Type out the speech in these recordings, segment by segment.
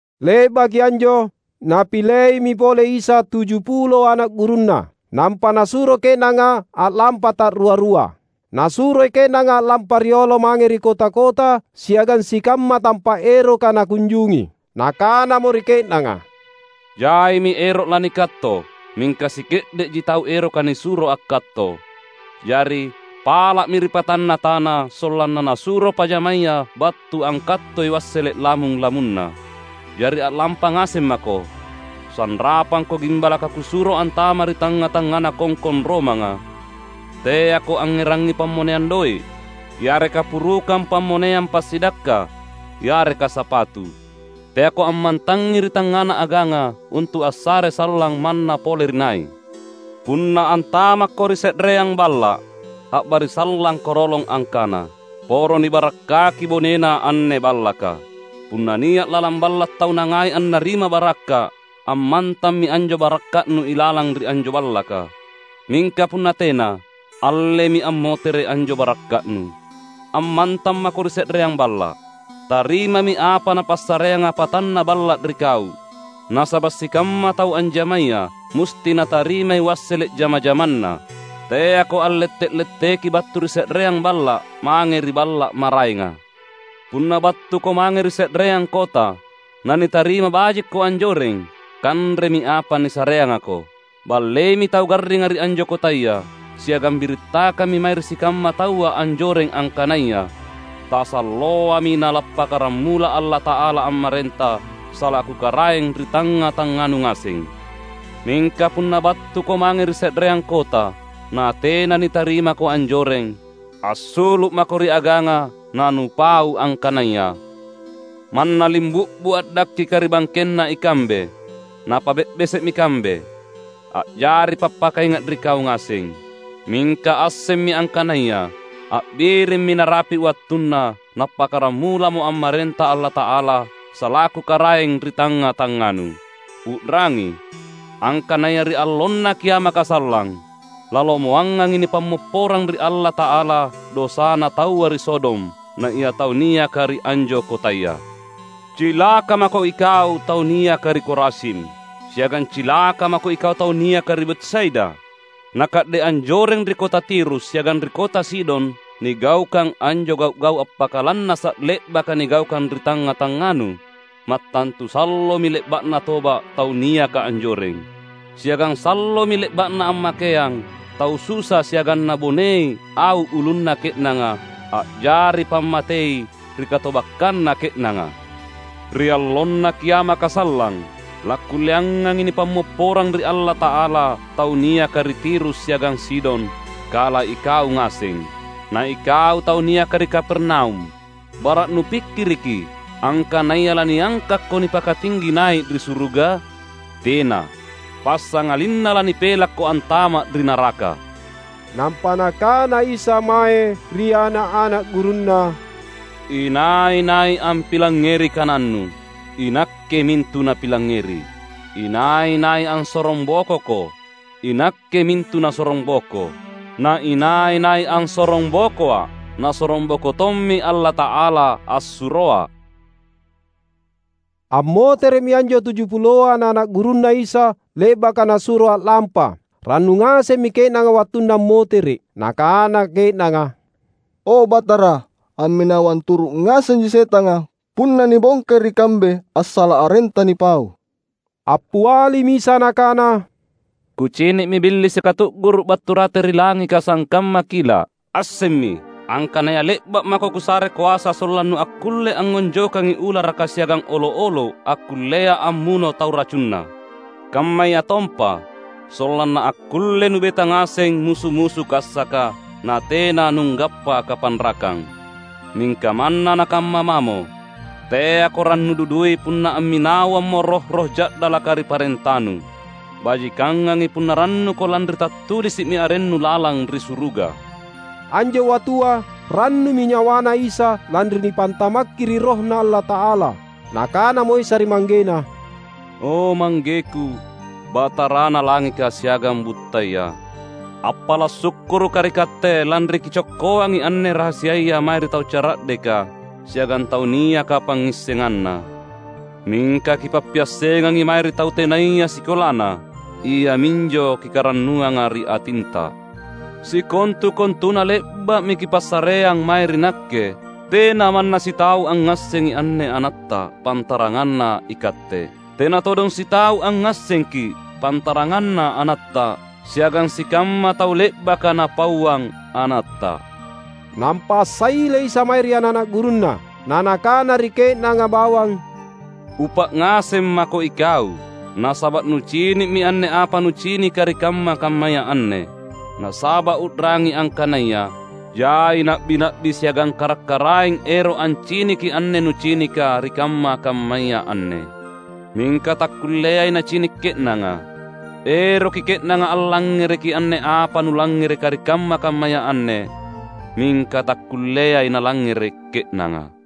Le’baki anjo Napileimi pole Isa tujupulo ana’ gurunNa, nampa Nasuro ke’nanga a’lampa ta’rua-rua. Nasuroi ke’nanga a’lampa riolo mange ri kota-kota siagang sikamma tampa’ eroka Nakunjungi. Nakanamo ri ke’nanga, "Jaimi ero’ lanikatto, mingka sike’de’ji tau eroka nisuro akkatto. Jari, pala’mi ri Patanna tana, sollanna Nasuro pajamaya battu angkattoi wassele’ lamung-lamunNa. Jari a’lampa ngaseng mako! Sanrapangko gimbalaka Kusuro antama’ ri tangnga-tangngana kongkong romanga. Teako angngerangngi pammoneang doe’, yareka purukang pammoneang passidakka, yareka sapatu. Teako ammantangngi ri tangngana aganga untu’ assare sallang manna pole ri nai. Punna antamakko ri se’reang balla’, a’barisallangko rolong angkana, ‘Poro nibarakkaki bonena anne ballaka.’ Punna nia’ lalang balla’ tau nangai annarima barakka’, ammantammi anjo barakka’nu ilalang ri anjo ballaka; mingka punna tena, allemi ammotere’ anjo barakka’nu. Ammantang mako ri se’reang balla’. Tarimami apa napassareanga patanna balla’ ri kau, nasaba’ sikamma tau anjamaya musti natarimai wassele’ jama-jamanna. Teako a’lette’-letteki battu ri se’reang balla’ mange ri balla’ maraenga. Punna battuko mange ri se’reang kota, na nitarima bajikko anjoreng, kanremi apa nisareangako. Balleimi tau garringa ri anjo kotaya, siagang birittakammi mae ri sikamma taua anjoreng angkanaya, ‘Tasalloami Nalappakkaramula Allata’ala ammarenta salaku Karaeng ri tangnga-tangnganu ngaseng.’ Mingka punna battuko mange ri se’reang kota, natena nitarimako anjoreng, assulu’ mako ri aganga na nupau angkanaya, ‘Manna limbu’bu’ a’dakkika ri bangkenna ikambe, napabe’bese’mi kambe, a’jari pappakainga’ ri kau ngaseng. Mingka assemmi angkanaya a’birimmi narapi’ wattunna Nappakkaramulamo ammarenta Allata’ala salaku Karaeng ri tangnga-tangnganu!’ U’rangi, angkanaya ri allonna kiamaka sallang, lalomoangangi nipammopporang ri Allata’ala dosana taua ri Sodom, naia tau niaka ri anjo kotaya!" "Cilaka mako ikau tau niaka ri Korazim! Siagang cilaka mako ikau tau niaka ri Betsaida. Naka’de’ anjoreng ri kota Tirus siagang ri kota Sidon nigaukang anjo gau’-gau’ appakalannasa’ le’baka nigaukang ri tangnga-tangnganu, mattantu sallomi le’ba’na toba’ tau niaka anjoreng. Siagang sallomi le’ba’na ammakeang tau susa siagang nabonei au ulunna ke’nanga, a’jari pammatei ri katobakkanna ke’nanga. Ri allonna kiamaka sallang, lakkulleangangi nipammopporang ri Allata’ala tau niaka ri Tirus siagang Sidon kala ikau ngaseng. Na ikau tau niaka ri Kapernaum! Bara’ nupikkiriki angkanaya laniangkakko nipakatinggi nai’ ri suruga? Tena! Passangalinna lanipelakko antama’ ri naraka!" Nampa Nakana Isa mae ri ana’-ana’ gurunNa, "Inai-nai ampilangngeri kanannu, iNakke mintu napilangngeri. Inai-nai ansorongbokoko, iNakke mintu nasorongboko. Na inai-nai ansorongbokoA’, nasorongboko tommi Allata’ala assuroA’." Ammotere’mi anjo tuju puloa ana’-ana’ gurunNa Isa, le’baka Nasuro a’lampa. Rannu ngasemmi ke’nanga wattunna ammotere’. Nakana ke’nanga, "O Batara, amminawang turu’ ngasengi setanga punna nibongkai ri kambe assala’ arenTa nipau!" Appialimi Isa Nakana, "Kucini’mi Billisika tu’guru’ battu rate ri langika sangkamma kila’. Assemmi, angkanaya le’ba’ mako Kusare koasa sollannu akkulle angngonjokkangi ularaka siagang olo’-olo’ akkullea ammuno tau racunna. Kammayatompa, sollanna akkulle nubeta ngaseng musu-musu kassaka, natena nunggappa kapanrakang. Mingka manna nakamma mamo, teako rannu dudui punna amminawammo roh-roh ja’dalaka ri parentanu. Bajikangangi punna rannuko lanri tattulisi’mi arennu lalang ri suruga." Anjo wattua rannumi nyawaNa Isa lanri nipantamakki ri RohNa Allata’ala. Nakanamo Isa ri ManggeNa, "O ManggeKu, Batarana langika siagang buttaya! Appala’ sukkurukKa’ ri Katte, lanri Kicokkoangi anne rahasiaya mae ri tau cara’deka siagang tau niaka pangngissenganna. Mingka Kipappiassengangi mae ri tau tenaya sikolana. Iaminjo Kikarannuanga ri atinTa. Sikontu-kontuna le’ba’mi Kipassareang mae ri Nakke. Tena manna sitau angngassengi anne AnatTa, pantaranganna iKatte. Tena todong sitau angngassengKi’, pantaranganna AnatTa, siagang sikamma tau le’baka Napauang AnatTa." Nampa assaile Isa mae ri ana’-ana’ gurunNa, na Nakana ri ke’nanga bawang, "Upa’ ngaseng mako ikau, nasaba’ nucini’mi anne apa nucinika ri kamma-kammaya anne. Nasaba’ u’rangi angkanaya: Jai na’bi-na’bi siagang karak-karaeng ero’ anciniki anne nucinika ri kamma-kammaya anne, mingka takkulleai nacini’ ke’nanga. Eroki ke’nanga allangngereki anne apa nulangngereka ri kamma-kammaya anne, mingka takkulleai nalangngere’ ke’nanga."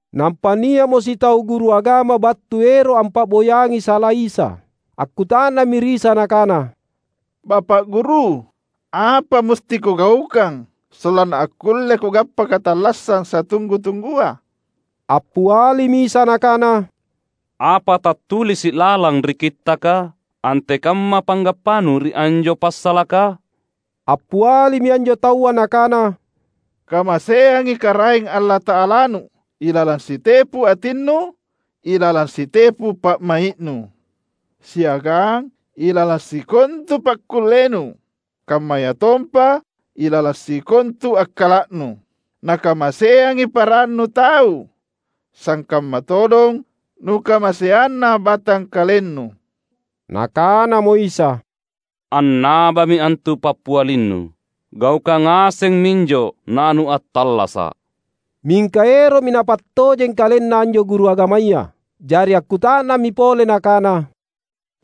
Nampa nia’mo sitau guru agama battu ero’ ampa’boyangi sala Isa. Akkuta’nammi ri Isa nakana, "Bapa’ Guru, apa musti kugaukang sollanna akkulle kugappa katallassang satunggu-tunggua?" Appialimi Isa Nakana, "Apa tattulisi’ lalang ri Kittaka? Antekamma panggappanu ri anjo passalaka?" Appialimi anjo taua nakana, "‘Kamaseangi Karaeng Allata’alanu ilalang sitepu atinnu, ilalang sitepu pa’mai’nu, siagang ilalang sikontu pakkullenu, kammayatompa ilalang sikontu akkala’nu,’ na ‘Kamaseangi parannu tau sangkamma todong nukamaseanna batangkalennu.’" Nakanamo Isa, "Annabami antu pappialinnu. Gaukang ngaseng minjo na nuattallasa’." Mingka ero’mi napattojeng kalenna anjo guru agamaya. Jari akkuta’nammi pole nakana,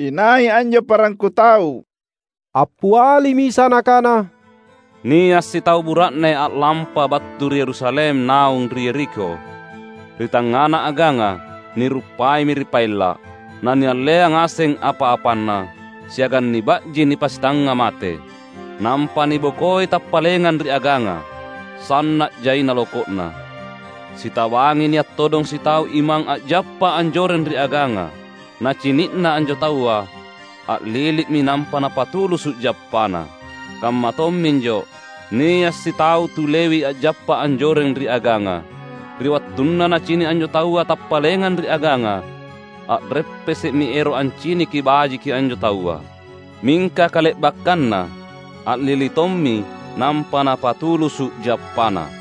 "Inai anjo parangku tau?" Appialimi Isa Nakana, "Nia’ sitau bura’ne a’lampa battu ri Yerusalem naung ri Yerikho. Ri tangngana aganga, niruppaimi ri paella’, nanialleang ngaseng apa-apanna, siagang niba’ji nipasitangnga-mate; nampa nibokoi tappalengang ri aganga, sanna’ jaina loko’na. Sitabangi nia’ todong sitau imang a’jappa anjoreng ri aganga. Nacini’na anjo taua, a’lilimi nampa napatulusu’ jappana. Kamma tomminjo, nia’ sitau tu Lewi a’jappa anjoreng ri aganga; ri wattunna nacini’ anjo taua tappalengang ri aganga, a’reppese’mi ero’ anciniki bajiki anjo taua; mingka kale’bakkanna a’lili tommi nampa napatulusu’ jappana.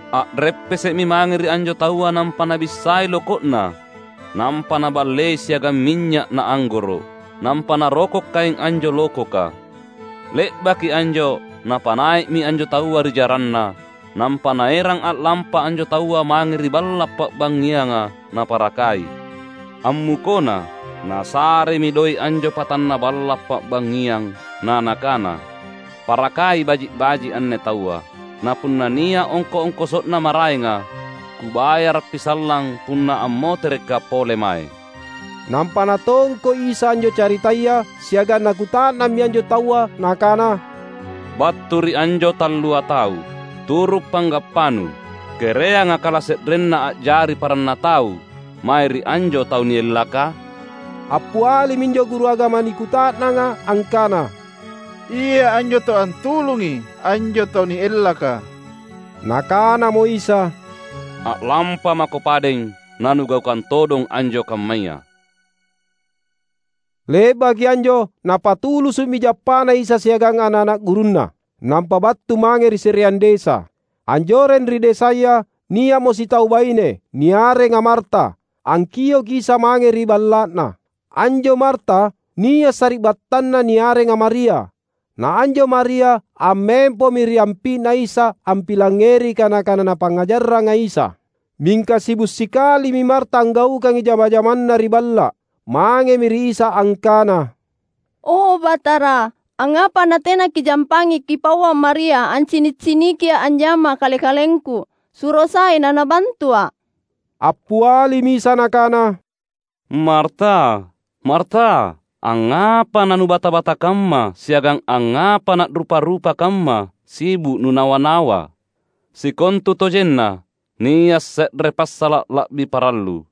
A’reppese’mi mange ri anjo taua nampa nabissai loko’na nampa naballei siagang minynya’ na anggoro’, nampa naroko’ kaeng anjo lokoka. Le’baki anjo napanai’mi anjo taua ri jaranna, nampa naerang a’lampa anjo taua mange ri balla’ pa’bangngianga naparakai. Ammukona, nasaremi doe’ anjo patanna balla’ pa’bangngiang; na nakana, ‘Parakai baji’-baji’ anne taua. Na punna nia’ ongko’-ongkoso’na maraenga, kubayarappi sallang punna ammoterekka’ pole mae.’" Nampa Natongko’ Isa anjo caritaya siagang Nakuta’nammi anjo taua Nakana, "Battu ri anjo tallua tau, turu’ panggappanu, kereanga kalase’renna a’jari paranna tau mae ri anjo tau niellaka?" Appialimi anjo guru agama nikuta’nanga angkana, "Ia anjo tau antulungai anjo tau niellaka." Nakanamo Isa, "A’lampamako padeng nanugaukang todong anjo kammaya!" Le’baki anjo Napatulusu’mi jappaNa Isa siagang ana’-ana’ gurunNa, nampa battu mange ri se’reang desa. Anjoreng ri desaya nia’mo sitau baine, niarenga Marta, angkioki Isa mange ri balla’na. Anjo Marta nia’ sari’battanna niarenga Maria. Na anjo Maria ammempomi ri ampi’Na Isa ampilangngeri kana-kana Napangngajarranga Isa. Mingka sibu’ sikalimi Marta anggaukangi jama-jamanna ri balla’. Mangemi ri Isa angkana, "O Batara, angngapa natena Kijampangi Kipauang Maria ancini’-cinikia’ anjama kale-kalengku? Suro sai nanabantua’!" Appialimi Isa Nakana, "Marta, Marta, angngapa na nubata-bata kamma siagang angngapa na’rupa-rupa kamma sibu’ nunawa-nawa? Sikontutojenna nia’ se’re passala’ la’bi parallu.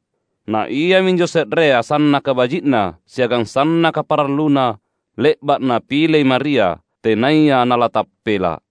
Na iaminjo se’rea, sannaka baji’na siagang sannaka paralluna le’ba’ napilei Maria, tenaya nalatappela’!"